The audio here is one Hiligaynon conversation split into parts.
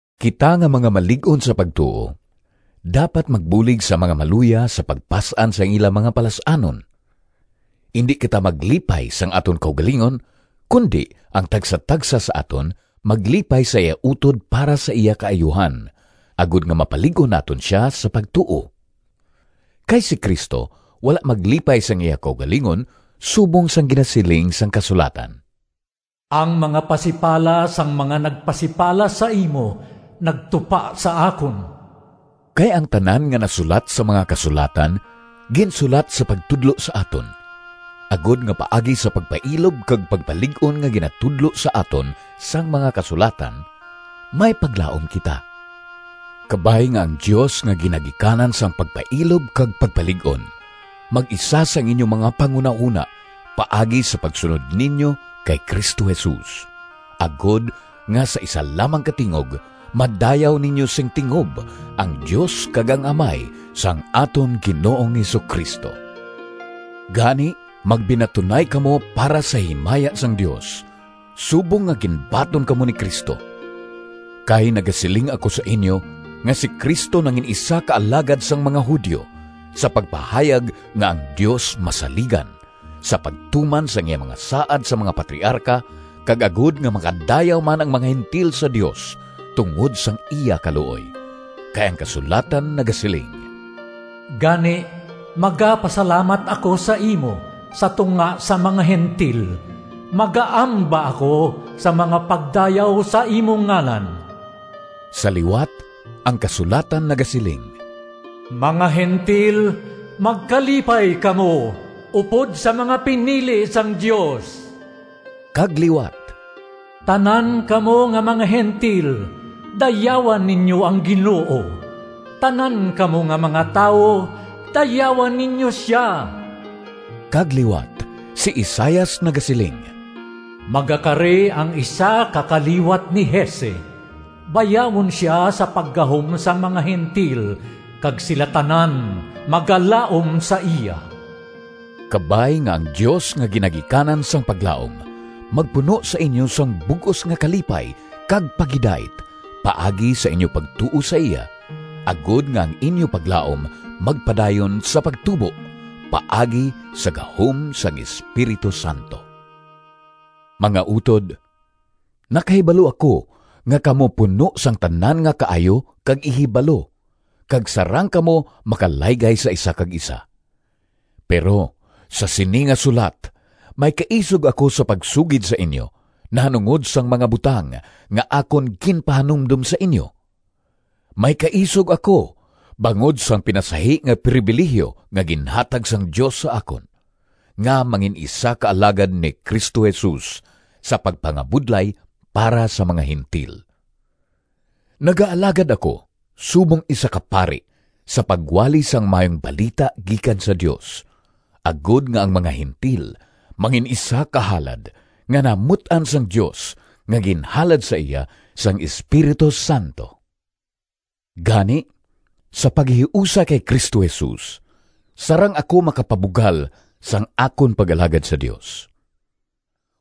Kita nga mga malig-on sa pagtuo dapat magbulig sa mga maluya sa pagpas-an sang ila mga palas-anon. Indi kita maglipay sang aton kaugalingon, kundi ang tagsatagsa sa aton maglipay sa iya utod para sa iya kaayuhan, agod nga mapalig-on naton sia sa pagtuo. Kay si Cristo wala maglipay sang iya kaugalingon subong sang ginasiling sang kasulatan, “Ang mga pasipala sang mga nagpasipala sa imo nagtupa sa akon.” Kay ang tanan nga nasulat sa mga Kasulatan ginsulat sa pagtudlo sa aton, agod nga paagi sa pagpailob kag pagpalig-on nga ginatudlo sa aton sang mga Kasulatan may paglaom kita. Kabay nga ang Dios nga ginagikanan sang pagpailob kag pagpalig-on mag-isa sang inyo mga panghunahona paagi sa pagsunod ninyo kay Cristo Jesus, agod nga sa isa lamang ka tingog madayaw ninyo sing tingob ang Dios kag ang Amay sang aton Ginoong Jesu-Cristo. Gani, magbinatunay kamo para sa himaya sang Dios, subong nga ginbaton kamo ni Cristo. Kay nagasiling ako sa inyo nga si Cristo nangin-isa ka alagad sang mga Judio, sa pagpahayag nga ang Dios masaligan, sa pagtuman sang iya mga saad sa mga patriarka, kag agod nga makadayaw man ang mga Gentil sa Dios tungod sang iya kaluoy. Kay ang kasulatan nagasiling: “Gani, magapasalamat ako sa imo Sa tunga sang mga Gentil, Magaamba ako sang mga pagdayaw Sa imo ngalan.” Sa liwat ang kasulatan nagasiling: “Mga Gentil, magkalipay kamo Upod sa mga pinili sang Dios!” Kag liwat: “Tanan kamo nga mga Gentil, Dayawa ninyo ang Ginoo; Tanan kamo nga mga tawo, Dayawa ninyo sia!” Kag liwat si Isaias nagasiling: “Magakari ang isa ka kaliwat ni Jese, Bayawon sia sa paggahom Sa mga Gentil, Kag sila tanan magalaom sa iya.” Kabay nga ang Dios nga ginagikanan sang paglaom, magpuno sa inyo sang bug-os nga kalipay kag paghidait paagi sa inyo pagtuo sa iya, agod nga ang inyo paglaom magpadayon sa pagtubo paagi sa gahom sang Espiritu Santo. Mga utod, nakahibalo ako nga kamo puno sang tanan nga kaayo kag ihibalo kag sarang kamo makalaygay sa isa kag isa. Pero, sa sini nga sulat may kaisog ako sa pagsugid sa inyo nahanungod sang mga butang nga akon ginpahanumdom sa inyo. May kaisog ako bangod sang pinasahi nga pribilihiyo nga ginhatag sang Dios sa akon, nga mangin-isa ka alagad ni Cristo Jesus sa pagpangabudlay para sa mga Gentil. Nagaalagad ako subong isa ka pari sa pagwali sang Maayong Balita gikan sa Dios, agod nga ang mga Gentil mangin-isa ka halad nga nahamut-an sang Dios nga ginhalad sa iya sang Espiritu Santo. Gani, sa paghiusa kay Cristo Jesus, sarang ako makapabugal sang akon pag-alagad sa Dios.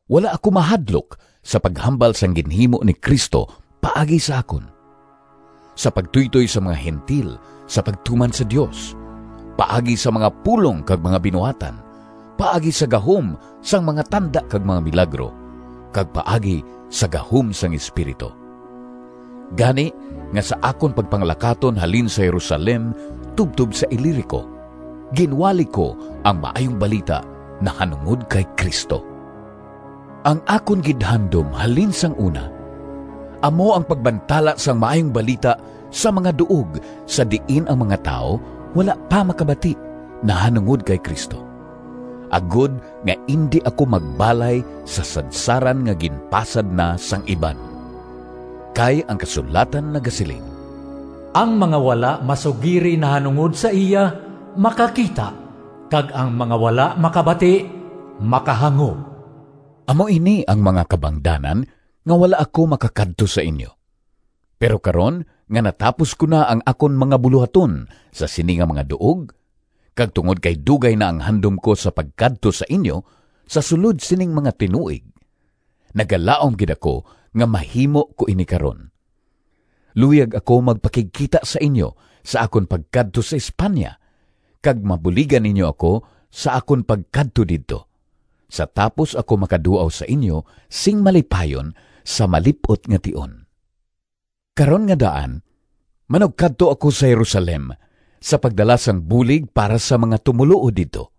Wala ako mahadlok sa paghambal sang ginhimo ni Cristo paagi sa akon, sa pagtuytoy sang mga Gentil sa pagtuman sa Dios, paagi sa mga pulong kag mga binuhatan, paagi sa gahom sang mga tanda kag mga milagro, kag paagi sa gahom sang Espiritu. Gani nga sa akon pagpanglakaton halin sa Jerusalem tubtob sa Ilirico, ginwali ko ang Maayong Balita nahanungod kay Cristo. Ang akon gid handom halin sang una amo ang pagbantala sang Maayong Balita sa mga duog sa diin ang mga tawo wala pa makabati nahanungod kay Cristo, agod nga indi ako magbalay sa sadsaran nga ginpasad na sang iban. Kay ang kasulatan nagasiling: “Ang mga wala masugiri Nahanungod sa iya makakita, Kag ang mga wala makabati Makahangop.” Amo ini ang mga kabangdanan nga wala ako makakadto sa inyo. Pero karon nga natapos ko na ang akon mga bulohaton sa sini nga mga duog kag tungod kay dugay na ang handom ko sa pagkadto sa inyo sa sulod sining mga tinuig, nagalaom gid ako nga mahimo ko ini karon. Luyag ako magpakigkita sa inyo sa akon pagkadto sa España, kag mabuligan ninyo ako sa akon pagkadto didto, sa tapos ako makaduaw sa inyo sing malipayon sa malip-ot nga tion. Karon nga daan manugkadto ako sa Jerusalem sa pagdala sang bulig para sa mga tumoluo didto.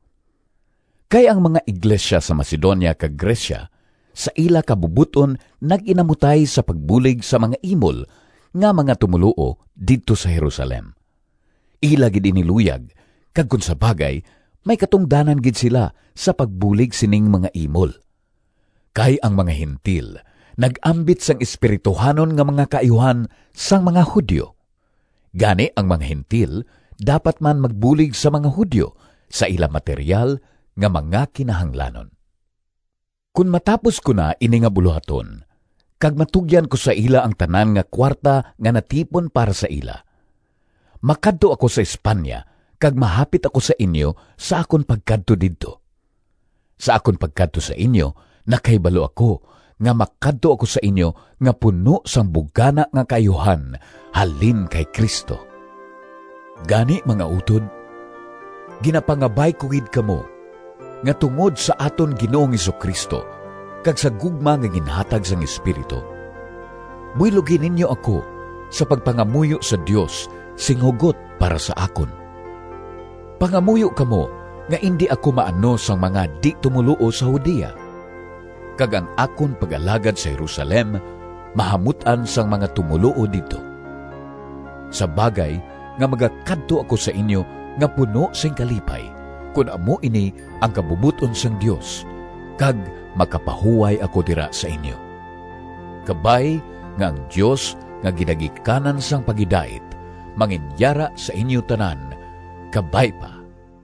Kay ang mga iglesia sa Macedonia kag Grecia sa ila kabubot-on nag-inamutay sa pagbulig sa mga imol nga mga tumoluo didto sa Jerusalem. Ila gid ini luyag, kag kon sa bagay may katungdanan gid sila sa pagbulig sining mga imol. Kay ang mga Gentil nag-ambit sang espirituhanon nga mga kaayuhan sang mga Judio. Gani ang mga Gentil dapat man magbulig sa mga Judio sa ila materyal nga mga kinahanglanon. Kon matapos ko na ini nga bulohaton, kag matugyan ko sa ila ang tanan nga kuwarta nga natipon para sa ila, makadto ako sa España kag mahapit ako sa inyo sa akon pagkadto didto. Sa akon pagkadto sa inyo, nakahibalo ako nga makadto ako sa inyo nga puno sang bugana nga kaayuhan halin kay Cristo. Gani, mga utod, ginapangabay ko gid kamo nga tungod sa aton Ginoong Jesu-Cristo kag sa gugma nga ginahatag sang Espiritu, buylogi ninyo ako sa pagpangamuyo sa Dios sing hugot para sa akon. Pangamuyo kamo nga indi ako maano sang mga di-tumoluo sa Judea, kag ang akon pag-alagad sa Jerusalem mahamut-an sang mga tumoluo didto, sa bagay nga magakadto ako sa inyo nga puno sing kalipay, kon amo ini ang kabubot-on sang Dios, kag makapahuway ako dira sa inyo. Kabay nga ang Dios nga ginagikanan sang paghidait manginyara sa inyo tanan. Kabay pa.